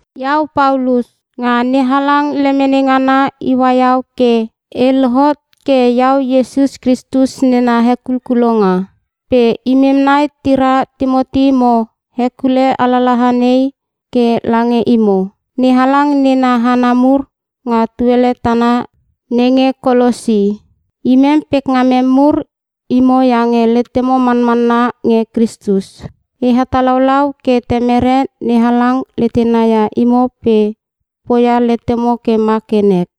Iau Paulus. Nga NeHalang lemene ngana iua iau ke e lohot ke iau Iesus Kristus nena hekulkulonga. Pe imem nai tira Timoti mo hekule alalaha nei ke lange imo NeHalang nena hana mur nga tuele tana nenge Kolosi. Imem pekngamem mur imo iange letemo manmanna nge Kristus. E hetalaulau ke Temere NeHalang letena ia imo pe poia letemo ke ma ke nek.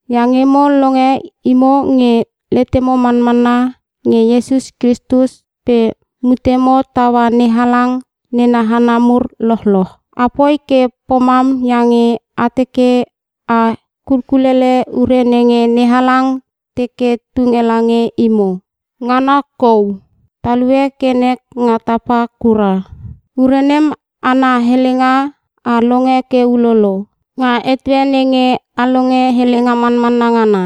Iange mo longe imo nge letemo manmanna nge Iesus Kristus pe mutemo taua NeHalang nena hana mur lochloch. Apoi ke pomam iange a teke a kulkulele ure nenge NeHalang teke tunge lange imo. Ngana kou, talue ke nek nga tapa kura. Ure nem, ana helenga a longe ke ulolo, nga etue nenge a longe helenga manmanna ngana.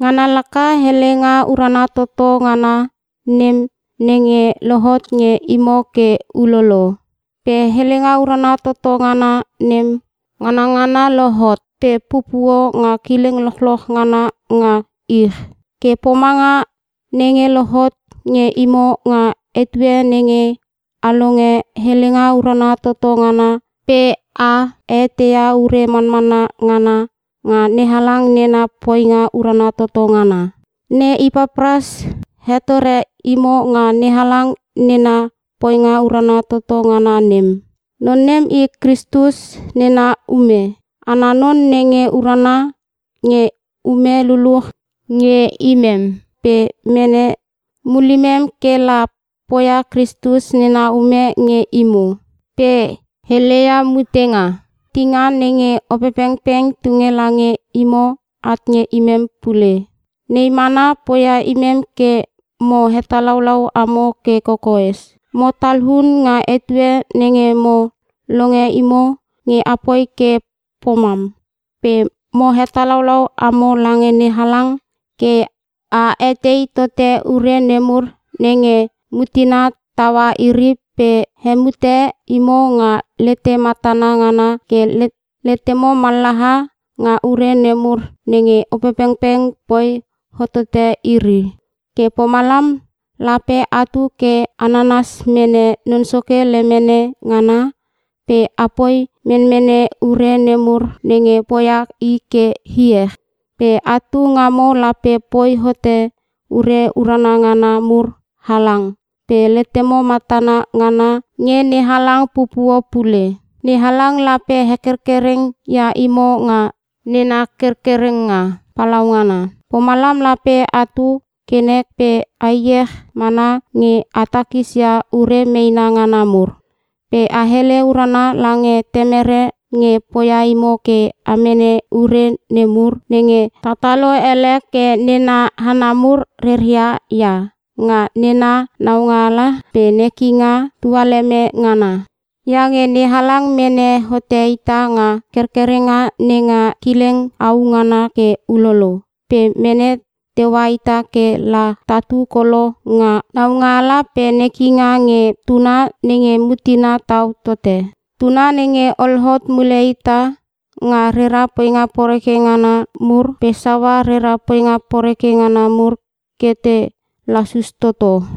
Ngana laka helenga urana toto ngana nem nenge lohot nge imo ke ulolo. Pe helenga urana toto ngana nem nganangana lohot pe pupuo nga kileng lochloch ngana nga ich. Ke pomanga nenge lohot nge imo nga etue nenge a longe helenga urana toto ngana pe a eteia ure manmanna ngana nga NeHalang nena poinga urana toto ngana. Ne Ipapras hetore imo nga NeHalang nena poinga urana toto ngana nem. Non nem i Kristus nena ume ana non nge urana nge ume lululuch nge imem pe mene mulimem ke la poia Kristus nena ume nge imo. Pe heleia mutenga nenge Opepengpeng tunge lange imo at nge imem pule. Nei mana poia imem ke mo hetalaulau amo ke kokoes. Mo talun nga etue nenge mo longe imo nge apoi ke pomam, pe mo hetalaulau amo lange NeHalang ke a etei tote ure nemur nenge mutena taua iri pe hemute imo nga lete matana ngana ke letemo mallaha nga ure nemur nenge Opepengpeng poi hotote iri. Ke pomalam lape atu ke a nanas mene Non Soke lemene ngana pe apoi menmene ure nemur nenge poia i ke iech. Pe atu ngamo lape poi hote ure urana ngana mur halang pe letemo matana ngana nge NeHalang pupuo pule. NeHalang lape hekerkereng ia imo nga nena kerkerenga palaungana. Pomalam lape atu ke nek pe a iech mana nge a takis ia ure meena ngana mur. Pe a hele urana lange Temere nge poia imo ke a mene ure nemur nenge tatalo ele ke nena hana mur reria ia nga nena naualanga pe nekinga tualeme ngana. Iange NeHalang mene hote ita nga kerkerenga nenga kileng au ngana ke ulolo pe mene teua ita ke la tatu kolo nga naungala pe nekinga nge Tuna nenge mutena tau tote. Tuna nenge ol hot mule ita nga rera poinga poreke ngana mur pe saua rera poinga poreke ngana mur ke te lasus toto.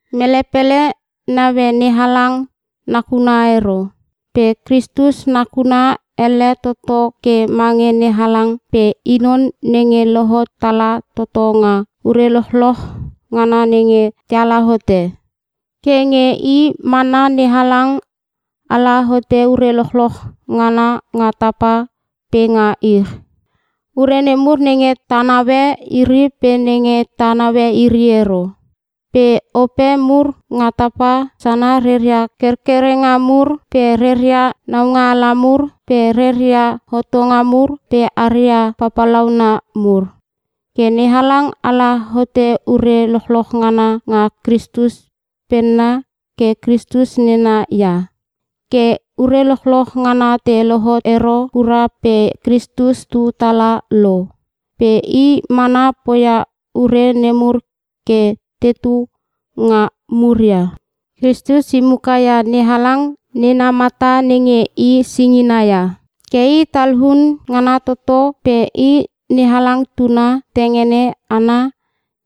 Mele pele naue NeHalang nakuna ero. Pe Kristus nakuna elle toto ke mange NeHalang pe i non nenge lohot tala toto nga ure lochloch ngana nenge teala hote. Ke nge i mana NeHalang ala hote ure lochloch ngana nga tapa pe nga ich. Ure nemur nenge ta naue iri pe nenge ta naue iri ero. Pe ope mur nga tapa sana reria kerkerenga mur pe reria naungaala mur pe reria hotonga mur pe aria papalauna mur. Ke NeHalang ala hote ure lochloch ngana nga Kristus penna ke Kristus nena ia. Ke ure lochloch ngana te lohot ero kura pe Kristus tu tala lo pe i mana poia ure nemur ke tetu nga muria. Kristus i muka ia NeHalang nena mata nenge i singina ia. Ke i talun ngana toto pe i NeHalang Tuna tengene ana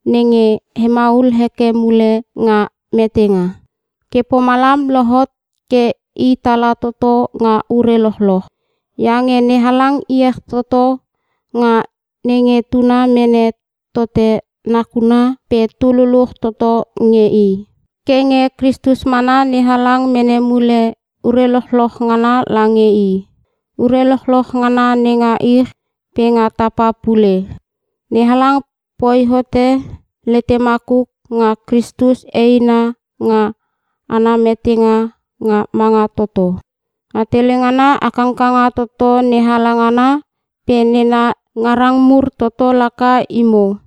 nenge hemaul heke mule nga metenga. Ke pomalam lohot ke i tala toto nga ure lochloch. Iange NeHalang iech toto nga nenge Tuna mene tote nakuna pe tu luluch toto nge i. Ke nge Kristus mana NeHalang mene mule ure lochloch ngana lange i. Ure lochloch ngana nenga ich pe nga tapa pule. NeHalang poi hote lete makuk nga Kristus eina nga ana metenga nga manga toto. Nga tele ngana a kangkanga toto NeHalang ana pe nena ngarang mur toto laka imo,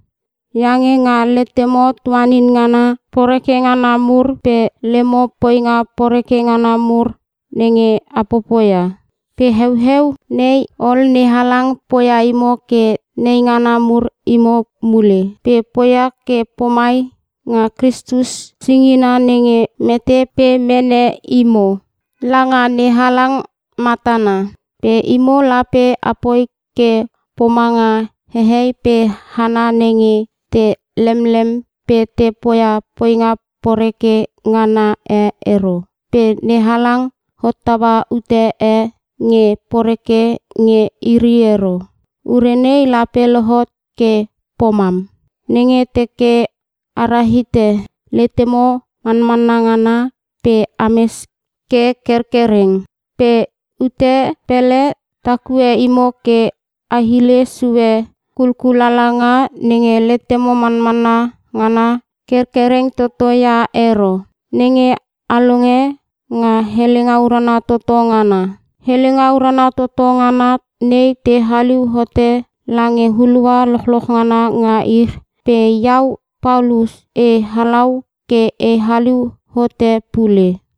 iange nga letemo tuanin ngana poreke ngana mur pe lemo poinga poreke ngana mur nenge a popoia. Pe heueu nei ol NeHalang poia imo ke neingana mur imo mule. Pe poia ke pomai nga Kristus singina nenge mete pe mene imo langa NeHalang matana. Pe imo lape apoi ke pomanga hehei pe hana nenge te lemlem pe te poia poinga poreke ngana e ero pe NeHalang hottaua ute e nge poreke nge iri ero. Ure nei lape lohot ke pomam, nenge teke a rahite letemo manmanna ngana pe ames ke kerkereng. Pe ute pele takue imo ke a hile sue kulkulalanga nenge letemo manmanna ngana kerkereng toto ia ero, nenge a longe nga helenga urana toto ngana. Helenga urana toto ngana nei te haliu hote lange hulua lochloch ngana nga ich, pe iau Paulus e halau ke e haliu hote pule.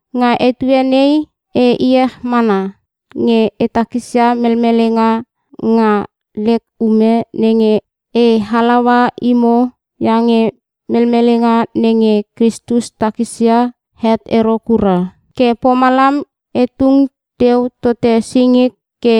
Nga etue nei e iech mana nge e takisia melmelenga nga lek ume nenge e halaua imo iange melmelenga nenge Kristus takisia, het ero kura. Ke pomalam e tung teu tote singik ke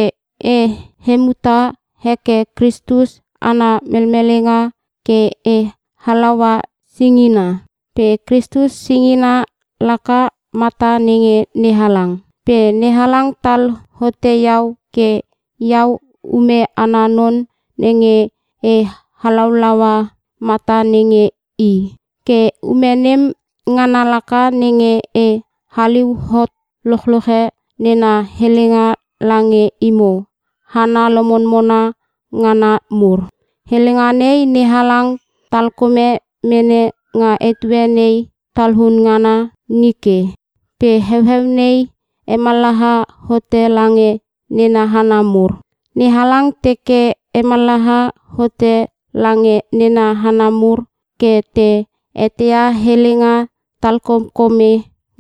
e hemuta heke Kristus ana melmelenga ke e halaua singina. Pe Kristus singina laka mata nenge NeHalang. Pe NeHalang tal hote iau ke iau ume ana non nenge e halaulaua mata nenge i. Ke ume nem ngana laka nenge e haliu hot lochloche nena helenga lange imo hana lomonmona ngana mur. Helenga nei NeHalang talkome mene nga etue nei talun ngana nike pe heueu nei hemallaha hote lange nena hana mur. NeHalang teke hemallaha hote lange nena hana mur ke te eteia helenga talkomkome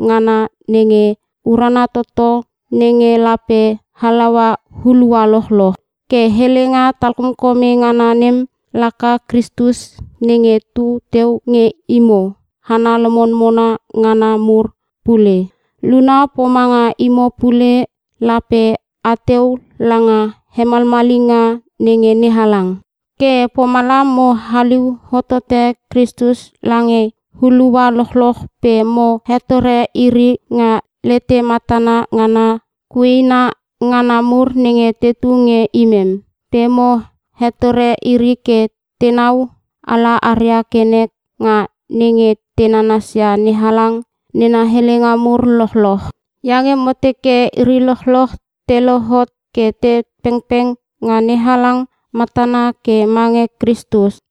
ngana nenge urana toto nenge lape halaua hulua lochloch. Ke helenga talkomkome ngana nem laka Kristus nenge tu teu nge imo hana lomonmona ngana mur pule. Luna pomanga imo pule lape ateu langa hemalmalinga nenge NeHalang. Ke pomalam mo haliu hotote Kristus lange hulua lochloch pe mo hetore iri nga lete matana ngana kuena ngana mur nenge tu nge imem. Pe mo hetore iri ke tenau ala aria ke nek nga nenge te nanasia NeHalang nena helenga mur lochloch. Iange mo teke iri lochloch te lohot ke te pengpeng nga NeHalang matana ke mange Kristus.